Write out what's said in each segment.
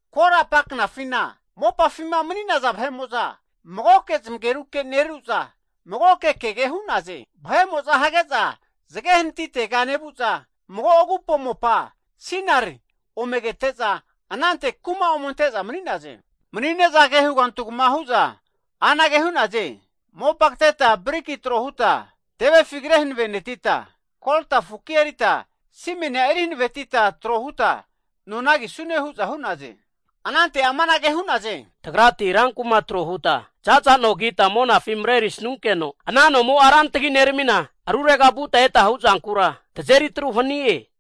Korapa knafina ama mopafima mani'naza vahe'mo'za magoke zamageruke neru'za, magoke kege hu'naze. Vahe'mo'za hage'za zage hanatitega nevu'za mago agupo mopa Sinar (Babiloni) ome kete'za, anante kuma ome ante'za mani'naze. Mani'ne'za ke hugantugama hu'za anage hu'naze, Mopa kateta briki tro huta tevefi kre hanavenetita, kolta fuki erita simenia eri hanavetita tro huta nona kisune hu'za hu'naze. Anante amanage hu'naze, Tagrati rankuma trohuta za'za no kita monafi marerisnunkeno, ana nomo'a ran tagi neramina, arurega vuta eta hu'zankura tazeri atru hanie.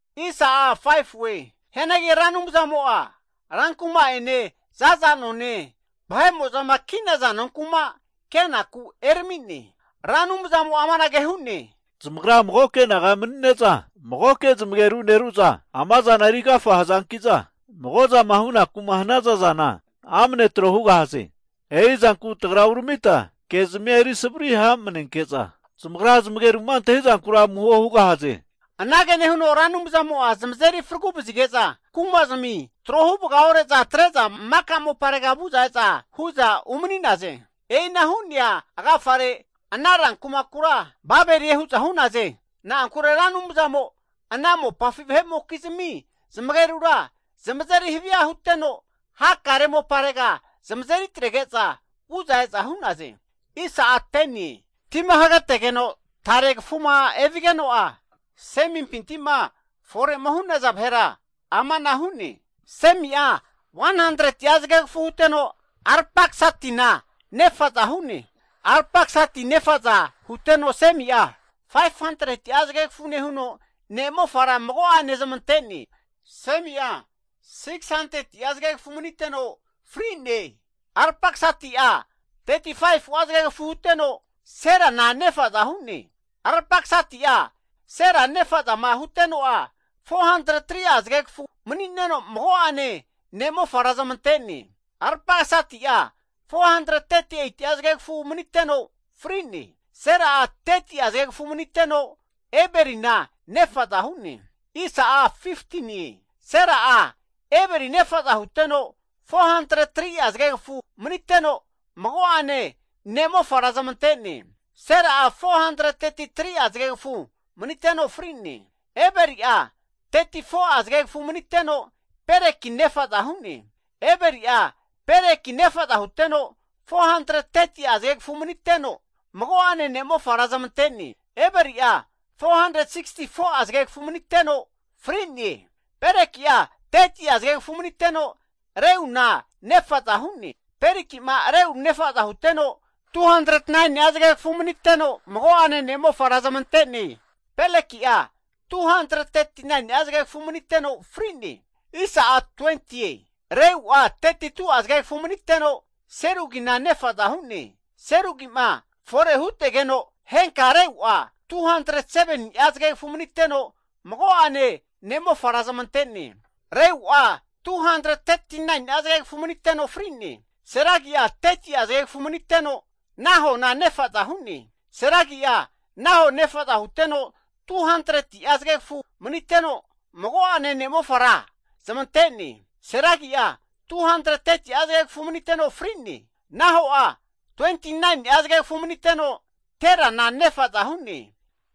Hianagi Ra Anumzamo'a rankuma'ene, zaza none, vahe'mo'zama ki'naza nonku'ma kenaku erami'ne. Ra Anumzamo'a amanage hu'ne, Zamagra magoke naga mani'ne'za magoke zamageru neru'za, amazana eri agafa hazankiza, mago'zama hunaku'ma hanaza zana, amne tro hugahaze. E'i zanku tagra uramita ke'zami eri savari hamanenke'za, zamagra zamageru'ma antahizankura amuho hugahaze. Anage nehuno Ra Anumzamo'a zamazeri fragu vazige'za kumazimi tro huvaga ore'za atre'za maka moparega vu'za e'za hu'za umani'naze. E'ina hu'nea agafare ana ran kumakura Babelie hu'za hu'naze. Na'ankure Ra Anumzamo ana mopafi vahe'mokizmi zamagerura zamazeri havia huteno, hakare moparega zamazeri atrege'za vu'za e'za hu'naze. Tima hagetegeno tare kafuma evigeno'a, Semimpinti'ma fore'ma hu'naza vahera amana hu'ne. Semi'a 100'a zagegafu huteno, Arpaksadina nefa'za hu'ne. Arpaksadi nafa'za huteno Semi'a 500'a zagegafu nehuno ne'mofara mago'ane zamante'ne. Semi'a 600'a zagegafu maniteno fri'ne. Arpaksadi'a 35'a zagegafu huteno, Selana nefa'za hu'ne. Arpaksadi'a Sela nefa'zama huteno'a, 403'a zagegafu nehuno mago'ane ne'mofara zamante'ne. Arpaksadi'a 438'a zagegafu huteno fri'ne. Sela'a 30'a zagegafu maniteno, Eberina nefa'za hu'ne. Sela'a Eberi nefa'za huteno 403'a zagegafu nehuno mago'ane ne'mofara zamante'ne, Sela'a 433'a zagegafu maniteno fri'ne. Eberi'a 34'a zagegafu maniteno, Peleki nefa'za hu'ne. Eberi'a Peleki nefaza huteno, 430'a zagegafu nehuno mago'ane ne'mofara zamante'ne. Eberi'a 464'a zagegafu maniteno fri'ne. Peleki'a 30'a zagegafu nehuno Reuna nefa'za hu'ne. Peleki'ma Reu nefa'za huteno 209ni'a zagegafu maniteno mago'ane ne'mofara zamante'ne. Peleki'a 239ni'a zagegafu maniteno fri'ne. Reu'a 32'a zagegafu maniteno, Serugina nefa'za hu'ne. Serugi'ma fore hutegeno henka Reu'a 207ni'a zagegafu maniteno, mago'ane ne'mofara zamante'ne. Reu'a 239ni'a zagegafu maniteno fri'ne. Serugi'a 30'a zagegafu maniteno, Nahona nefa'za hu'ne. Serugi'a Naho nefaza huteno 200'a zagegafu maniteno, mago'ane ne'mofara zamante'ne. Serugi'a 230'a zagegafu huteno fri'ne. Naho'a 29ni'a zagegafu nehuno, Terana nefa'za hu'ne.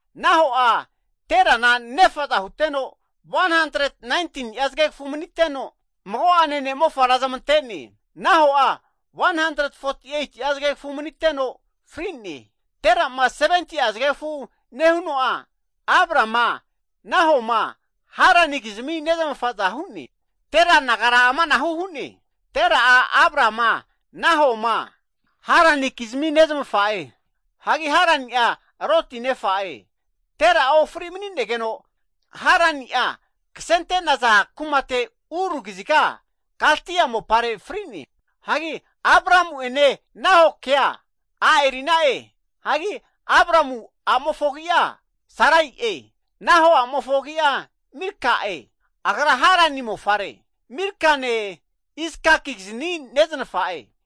Naho'a, Terana nefa'za huteno 119ni'a zagegafu maniteno, mago'ane ne'mofara zamante'ne, Naho'a 148'a zagegafu maniteno fri'ne. Tera'ma 70'a zagegafu nehuno'a Abrama, Nahoma, Haranikizmi nezmafa'za hu'ne. Tera nagara amanahu hu'ne. Tera'a Abrama, Nahoma, Haranikizmi nezmafa'e. Hagi Harani'a Loti nefa'e. Tera'a ofri mani'negeno, Harani'a kasente'naza kumate Ur kaziga Kaldi'a mopare fri'ne. Hagi Abramu'ene Nahokea a' eri'na'e. Hagi Abramu a'mofo agi'a Sarai'e. Naho a'mofo agi'a Milka'e, agra Harani mofare. Milkane Iskakizni neznafa'e.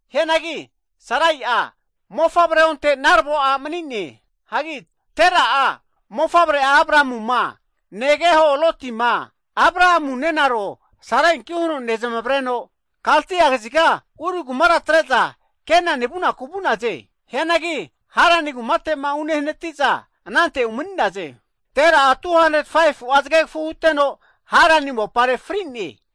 Hianagi Sarai'a mofavre onte narvo a' mani'ne. Hagi Tera'a mofavre'a Abramuma, negeho Lotima Abramu nenaro Sarainki huno nezmavreno Kaldi'a kaziga Ur kumara atre'za Kenani vunaku vu'naze. Hianagi Harani kumate'ma unehanati'za anante umani'naze. Tera'a 205fu'a zagegafu huteno, Harani mopare fri'ne.